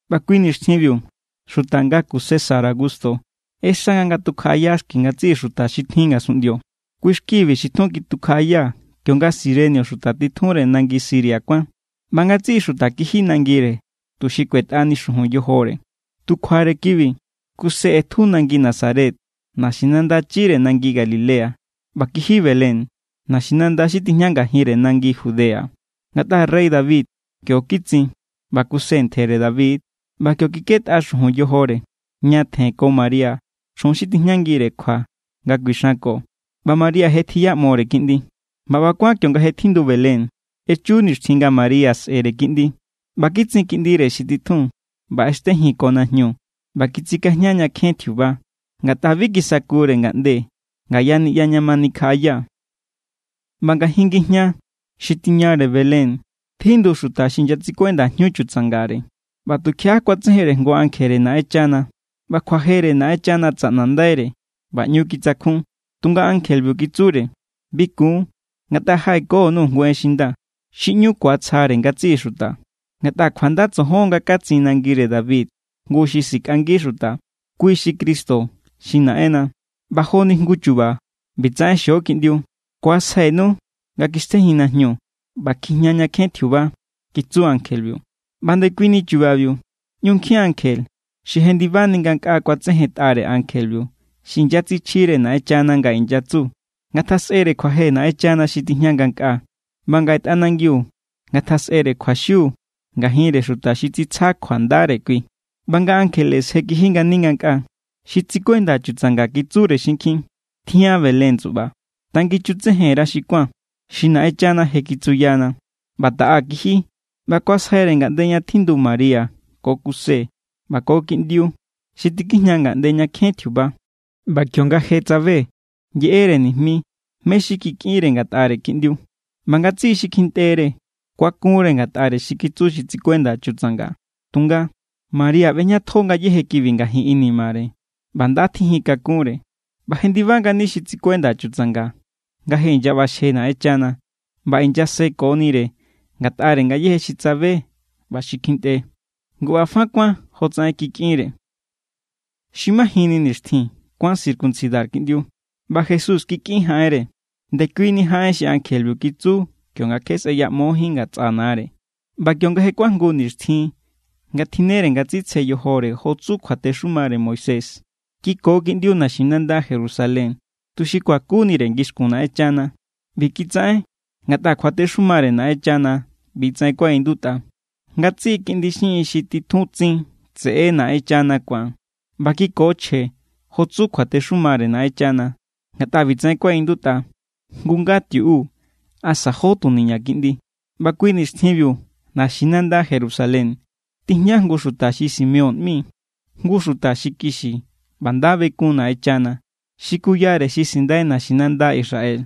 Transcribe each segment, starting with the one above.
ꞌBa kui nixtjinbiu xuta ngaku César Augusto ꞌexa nga ngatukjaꞌaya xki ngatsiꞌi xuta xi tjin ngasunꞌndio. Kui= xkibi xi tjun kitukjaꞌaya kionga Cirenio xuta titjunre nangi Siria kuán. ꞌBa ngatsiꞌi xuta kiji nangire tuxi kuetꞌani xujun yojore. Tu kjuare kibi, Kuse ꞌetju Nazaret, naxinanda chire nangi Galilea, ꞌba kiji Belén, naxinanda xi tijña ngajinre nangi Judea. Ngatꞌa rey David kio kitsin, ꞌba Kuse ntjere David=. ꞌBa kio kikꞌetꞌa xujun yojore, ñatjen ko María, chjun xi tijñangire kjua nga kuixanko. ꞌBa María je tjiꞌyamore kiꞌndi. ꞌBa ꞌba kuán kionga je tjindu Belén, echu nixtjin nga María sꞌe̱re kiꞌndi. ꞌBa kitsin kiꞌndire xi titjun, ꞌba ꞌextejin ko najñu ꞌba kitsikajña ña kjen tjiuba, ngatꞌa bi kisakure ngaꞌnde ngaya niꞌya ña ma nikjaꞌaya. ꞌBa ngajin ngijña xi tiñare Belén tjindu xuta xi inyatsikuenda jñu chutsangare. ꞌBa tukjiaꞌa kuatsejenre jngu ankjere Naꞌenchana, ꞌba kjuajere Naꞌenchana tsaꞌnandaire; ꞌba ꞌñu kitsakjun. Tunga ankjebiu kitsure: —Bi kun, ngatꞌa jaꞌekonu jngu en xi nda, xi ꞌñu ku̱atsjare ngatsiꞌi xuta. Ngatꞌa kjuanda tsojon nga katsin nangire David jngu xi sikꞌangi xuta. Kui xi Cristo xi Naꞌenna. ꞌBa joni jngu chu̱ba̱ ꞌbitsaꞌen xio kiꞌndiu: kuasjainu nga kjixtejin najñu ꞌba kjijña ña kjen tjiuba —kitsu ankjebiu. ꞌBa ndekuini chubabiu ꞌñu nkjin ankje xi jendibani ngankꞌaa kuatsejentꞌare ankjebiu xi inyatsichjire Naꞌenchana nga inyatsu: ¡Ngatjasꞌere kjuaje Naꞌenchana xi tijña ngankꞌaa! ¡ꞌBa ngaꞌe tꞌanangiu ngatjasꞌere kjuaxiu ngajinre xuta xi tsitsja kjuandare kui! ꞌBa nga ankjele je kiji ngani ngankꞌaa, xi tsikuenda chutsanga kitsure xinkjin: —Tjian Belén, tsuꞌba. Tangichutsejen_ra xi kuán, xi Naꞌenchana je kitsuyana. ꞌBa taꞌa kiji, ꞌba kuasjaire ngaꞌnde ña tjindu María ko Kuse ꞌba ko kiꞌndiu xi tikijña ña kjen tjiuba. ꞌBa kionga je tsabe, yeꞌere nijmi mé= xi kikꞌinre ngatꞌare kiꞌndiu. ꞌBa ngatsiꞌi xi kjintꞌere kuakunre ngatꞌare xi kitsu xi tsikuenda chutsanga. Tunga María ꞌbejñatjo ngayéje kibi ngajin inimare, ꞌba nda tjinjin kakunre. ꞌBa jendiba ngani xi tsikuenda chutsanga nga je inyaꞌbaxje Naꞌenchana ꞌba inyasekonire ngatꞌare ngayéje xi tsabe ꞌba xi kjintꞌe. Ngu ꞌba fa kuán jotsaꞌen kikꞌinre. Xi majinni nixtjin, kuán circuncidar kiꞌndiu, ꞌba Jesús kikꞌin jaꞌenre, ndekuini jaꞌen xi ankjebiu kitsu kionga kje sꞌeyaꞌmojín ngatsꞌa nare. ꞌBa kionga je kuajngu nixtjin nga tjinnere nga tsitsje yojore jo tsu kjuatexumare Moisés, kiko kiꞌndiu naxinanda Jerusalén, tuxi kuakunire ngixkun Naꞌenchana. ꞌBi kitsaꞌen ngatꞌa kjuatexumare Naꞌenchana ꞌbitsaꞌen kuaꞌindutꞌa: “Ngatsiꞌi kiꞌndi xiꞌin xi titjun tsin tseꞌe= Naꞌenchana ku̱an.” ꞌBa kiko chje jo tsu kjuatexumare Naꞌenchana, ngatꞌa ꞌbitsaꞌen kuaꞌindutꞌa: “Jngu nga tiuꞌu asa jó tuniña kiꞌndi.” ꞌBa kui nixtjinbiu naxinanda Jerusalén tijña jngu xuta xi Simeón ꞌmi. Jngu xuta xi kixi ꞌba nda bekun Naꞌenchana xi kuyare xi sindai naxinanda Israel.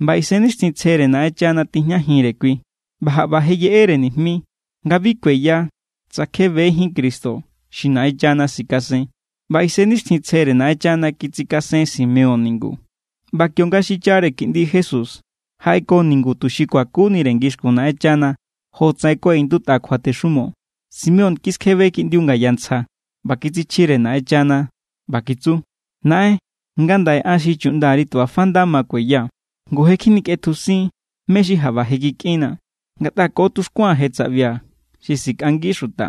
ꞌBa Isennixtjintsjere Naꞌenchana tijñajinre kui. ꞌBa jaꞌba je yeꞌere nijmi nga bi kueya tsa kje bejín Cristo xi Naꞌenchana sikasen. ꞌBa Isennixtjintsjere Naꞌenchana kitsikasen Simeón ningu. ꞌBa kionga xichare kiꞌndi Jesús jaꞌeko ningu tuxi kuakunire ngixkun Naꞌenchana jotsaꞌen kuaꞌindutꞌa kjuatexumo, Simeón kiskjebe kiꞌndiu ngaya ntsja ꞌba kitsichjire Naꞌenchana ꞌba kitsu: Naꞌen, ngandaꞌe an xi chuꞌndari tu ꞌba fa nda ma kueya, ngu je kjinikꞌetjusin mé= xi jaꞌba je kikꞌinnaa̱, ngatꞌa ko tuxkuaa̱n je tsaꞌbia̱ xi sikꞌangi xuta,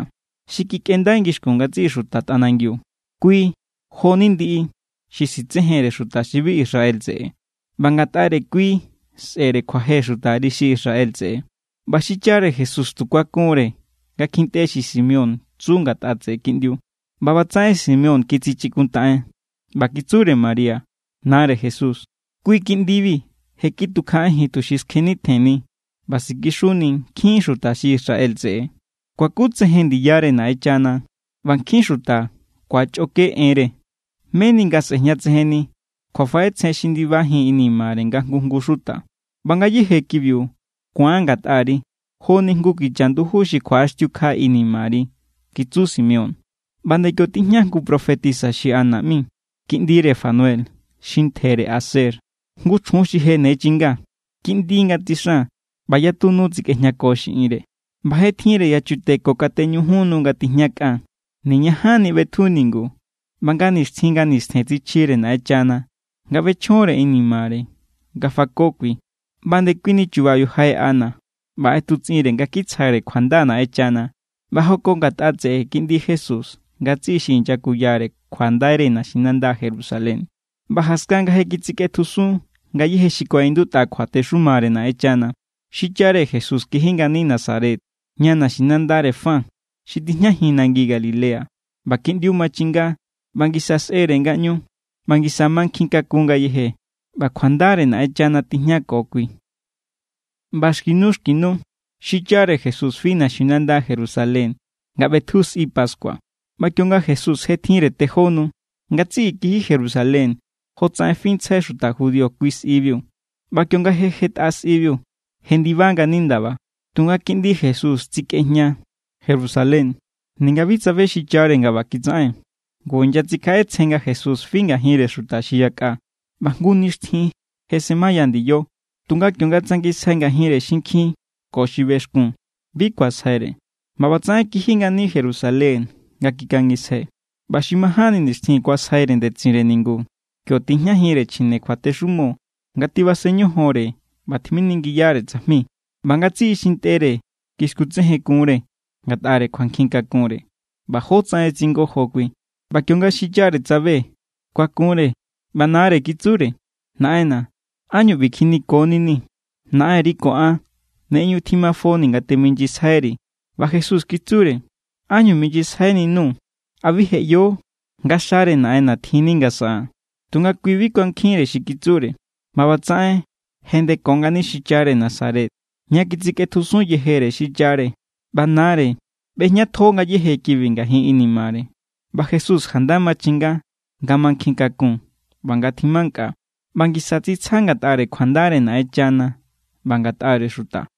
xi kikꞌendai ngixkun ngatsiꞌi xuta tꞌanangiu. Kui jo=ni ndiꞌi xi sitsejenre xuta xi bi Israel tseꞌe, ꞌba ngatꞌare kui sꞌe̱re kjuaje xutari xi Israel tseꞌe. ꞌBa xichare Jesús tu kuakun=re nga kjintꞌe xi Simeón tsu ngatꞌa tseꞌe kiꞌndiu. ꞌBa ꞌbatsaꞌen Simeón kitsichikuntaꞌen, ꞌba kitsure María, nare Jesús: —Kui kiꞌndibi je kitukjaꞌajin tuxi skjenitjenni ꞌba sikixuni nkjin xuta xi Israel tseꞌe. Kuakutsejen ndiyare Naꞌenchana ꞌba nkjin xuta ku̱achꞌoke enre, meni nga sꞌe̱jñatsejenni kjuafaꞌetsjen xi ndibajin inimare nga jngu jngu xuta. ꞌBa ngayéje kibiu ku̱an ngatꞌari joni jngu kicha nduju xi kjuaꞌaxtiukja inimari —kitsu Simeón. ꞌBa nde kio tijña jngu profetisa xi Ana ꞌmi, kiꞌndire Fanuel, xi ntjere Aser. Jngu chjun xi je ne chinga. Kiꞌndi nga tsixan, ꞌba yatu nu tsikꞌejñako xiꞌinre, ꞌba je tjinre yachute ko kateñujun nu nga tijña kꞌan. Niñajanni ꞌbetju ningu. ꞌBa nga nixtjin nga nistjen tsichjire Naꞌenchana nga ꞌbechjonre inimare nga fako kui. ꞌBa ndekuini chubabiu jaꞌe Ana ꞌba ꞌetutsꞌinre nga kitsjare kjuanda Naꞌenchana, ꞌba jako ngatꞌa tseꞌe kiꞌndi Jesús ngatsiꞌi xi inyakuyare kjuandaire naxinanda Jerusalén. ꞌBa jaskan nga je kitsikꞌetjusun ngayéje xi kuaꞌindutꞌa kjuatexumare Naꞌenchana, xichare Jesús kiji ngani Nazaret, ña naxinandare fa xi tijñajin nangi Galilea. ꞌBa kiꞌndiu machinga ꞌba ngisa sꞌere ngaꞌñu, ꞌba ngisa mankjin kakun ngayeje, ꞌba kjuandare Naꞌenchana tijñako kui. ꞌBa xki nu, xki nu xichare Jesús fi naxinanda Jerusalén, nga ꞌbetju sꞌi pascua. ꞌBa kionga Jesús je tjinre tejó nu, ngatsiꞌi kiji Jerusalén jotsaꞌen fintsjai xuta judío kui sꞌibiu. ꞌBa kionga je jetꞌa sꞌibiu, jendiba ngani ndaba, tunga kiꞌndi Jesús tsikꞌejña Jerusalén, ninga bi tsabe xichare nga ꞌba kitsaꞌen. Ngu inyatsikjaꞌetsjen nga Jesús fi ngajinre xuta xi yakꞌa, ꞌba jngu nixtjin je semaya ndiyo. Tunga kionga tsangisjai ngajinre xinkjin ko xi bexkun, bi kuasjaire. ꞌBa ꞌbatsaꞌen kiji ngani Jerusalén nga kikangisjai. ꞌBa xi majánni nixtjin kuasjaire ndetsinre ningu. Kio tijñajinre chjine kjuatexumo nga tibasen ñojonre ꞌba tjiminingiyare tsajmi. ꞌBa ngatsiꞌi xi ntꞌere kiskutsejenkun=re ngatꞌare kjuankjinkakunre ꞌba jótsaꞌen tsingojo kui. ꞌBa kionga xichare tsabe, kuakunre. ꞌBa nare kitsure: —Naꞌenna̱, ¿ánñu ꞌbi kjinikoninii̱? Naꞌenri ko an ne ꞌñu tjimafonii̱ nga teminyisjairi̱. ꞌBa Jesús kitsure: —¿Ánñu minyisjaininuu̱? ¿A bi je ꞌyo nga xare Naꞌenna̱ tjinni nga saꞌaa̱n? Tunga kui bi kuankjinre xi kitsure. ꞌBa ꞌbatsaꞌen jendeko ngani xichare Nazaret, ña kitsikꞌetjusun yejere xichare. ꞌBa nare ꞌbejñatjo ngayéje kibi ngajin inimare. ꞌBa Jesús janda machinga nga mankjin kakun ꞌba nga tjimankꞌa, ꞌba ngisa tsitsja ngatꞌare kjuandare Naꞌenchana ꞌba ngatꞌare xuta.